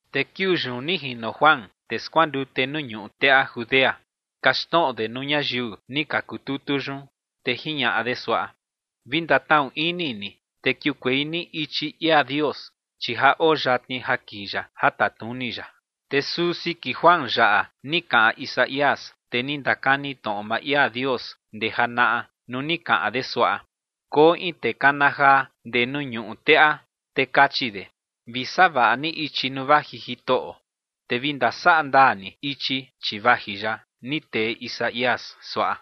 Te kiuu yun ni jino Juan, tee skuandute nuu ñuꞌu teꞌa Judea kaxtnoꞌo de nuu ñayiu ni ka kututu yun. Te jiñaꞌa de suaꞌa: ͏―͏Vi ndatnaꞌu ini ni, te kiukuei ni ichi ia Dios, chi ja oo yatni ja kii ya ja tatnuni ya. Te suu siki Juan yaꞌa ni kaꞌan Isaías, tee ni ndakani tnoꞌo maa ia Dios ndee janaꞌa nuu ni kaꞌan de suaꞌa: Koo in tee kana jaa ndee nuu ñuꞌu teꞌa, te kachi de: “Vi savaꞌa ni ichi nuu vaji Jitoꞌo, te vi ndasaꞌa ndaa ni ichi, chi vaji ya”, ni tee Isaías suaꞌa.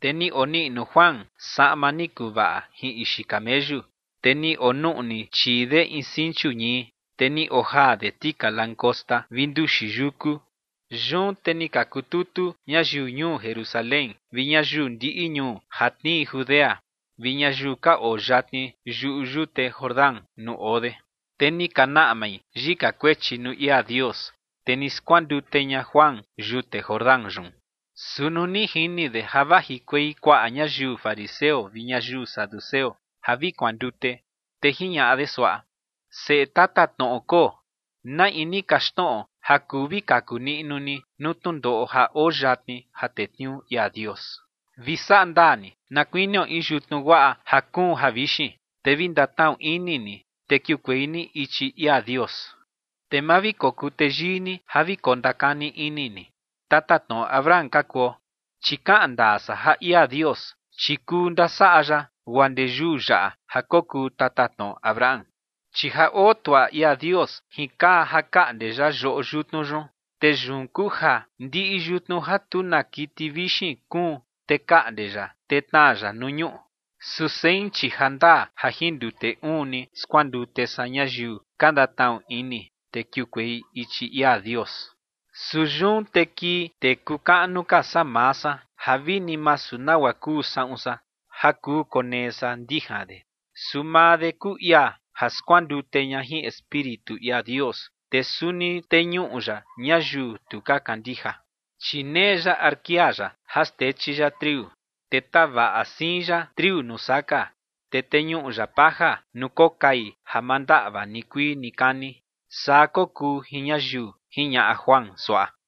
Te ni oniꞌnu Juan saꞌma ni kuvaꞌa jin ixi kameyu, te ni onuꞌni chii de in sinchu ñii, te ni ojaa de tika langosta vi nduxi yuku. Yun te ni ka kututu ñayiu ñuu Jerusalén vi ñayiu ndiꞌi ñuu ja tnii Judea vi ñayiu ka oo yatni yuꞌu yute Jordán nuu oo de. Te ni ka naꞌmai yika kuechi nuu ia Dios, te ni skuandute ña Juan yute Jordán yun. Su nuu ni jini de ja vajikuei kuaꞌa ñayiu fariseo vi ñayiu saduceo ja vi kuandute, te jiñaꞌa de suaꞌa: ͏―͏Seꞌe tatatnoꞌo koo, ¿na in ni kaxtnoꞌo ja kuu vi kaku niꞌnu ni nuu tnundoꞌo ja oo yatni ja tetniuu ia Dios? Vi saꞌa ndaa ni na kuinio in yutnu guaꞌa ja kuun javixin, te vi ndatnaꞌu ini ni, te kiukuei ni ichi ia Dios. Te ma vi kokuu teyii ni ja vi kondakani ini ni: “Tatatnoꞌo Abraham ka kuo”, chi kaꞌan ndaa san ja ia Dios, chi kuu ndasaꞌa ya guaa ndee yuu yaꞌa ja kokuu tatatnoꞌo Abraham. Chi ja oo tuaꞌa ia Dios jin kaa ja kaꞌnde ya yoꞌo yutnu yun, te yun kuu ja ndiꞌi yutnu ja tu na kiti vixin kuun, te kaꞌnde ya, te tnaa ya nuu ñuꞌu. Su sein, chi ja ndaa ja jin ndute uun ni skuandute san ñayiu ka ndatnaꞌu ini, te kiukuei ichi ia Dios. Su yun te kii tee kuu kaꞌnu ka saa maa san ja vini masu nagua kuu saꞌun san ja kuu konee san ndijan de. Su maa de kuu ia ja skuandute ña jin Espíritu ia Dios, te suni teñuꞌu ya ñayiu tu ka kandija. Chi nee ya arkia ya ja xtechi ya triu. Te tavaꞌa siin ya triu nuu saka, te teñuꞌu ya paja nuu kokai ja ma ndaꞌva nikuii nikani. Saa kokuu jin ñayiu ͏―͏jiñaꞌa Juan suaꞌa.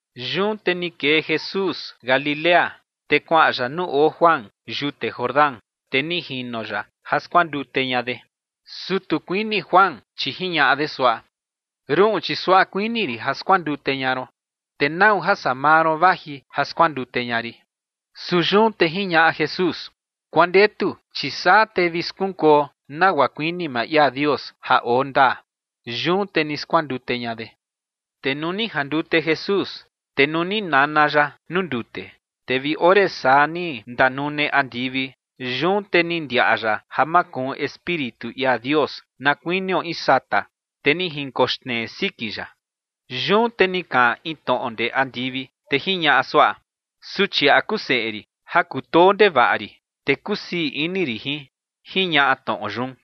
Yun te ni kee Jesús Galilea, te kuaꞌan ya nuu oo Juan yute Jordán, te ni jino ya ja skuandute ña de. Su tu kuini Juan, chi jiñaꞌa de suaꞌa: ͏―͏Ruꞌun, chi suaꞌa kuini rin ja skuandute ña ron, te ¿nau ja saa maa ron vaji ja skuandute ña rin? Su yun te jiñaꞌa Jesús: ͏―͏Kuandetu, chi saa te vi skunkuo nagua kuini maa ia Dios ja oo ndaa. Yun te ni skuandute ña de. Te nuu ni jandute Jesús, te nuu ni nana ya nuu ndute, te vi ore saa ni ndanune andivi. Yun te ni ndiaꞌa ya ja makuun Espíritu ia Dios na kuinio in sata, te ni jinkoxnee siki ya. Yun te ni kaꞌan in tnoꞌo ndee andivi, te jiñaꞌa suaꞌa: ͏―͏Suchiaꞌa kuu seꞌe rin ja kutoo ndevaꞌa rin, te kusii ini rin jin ͏―͏jiñaꞌa tnoꞌo yun.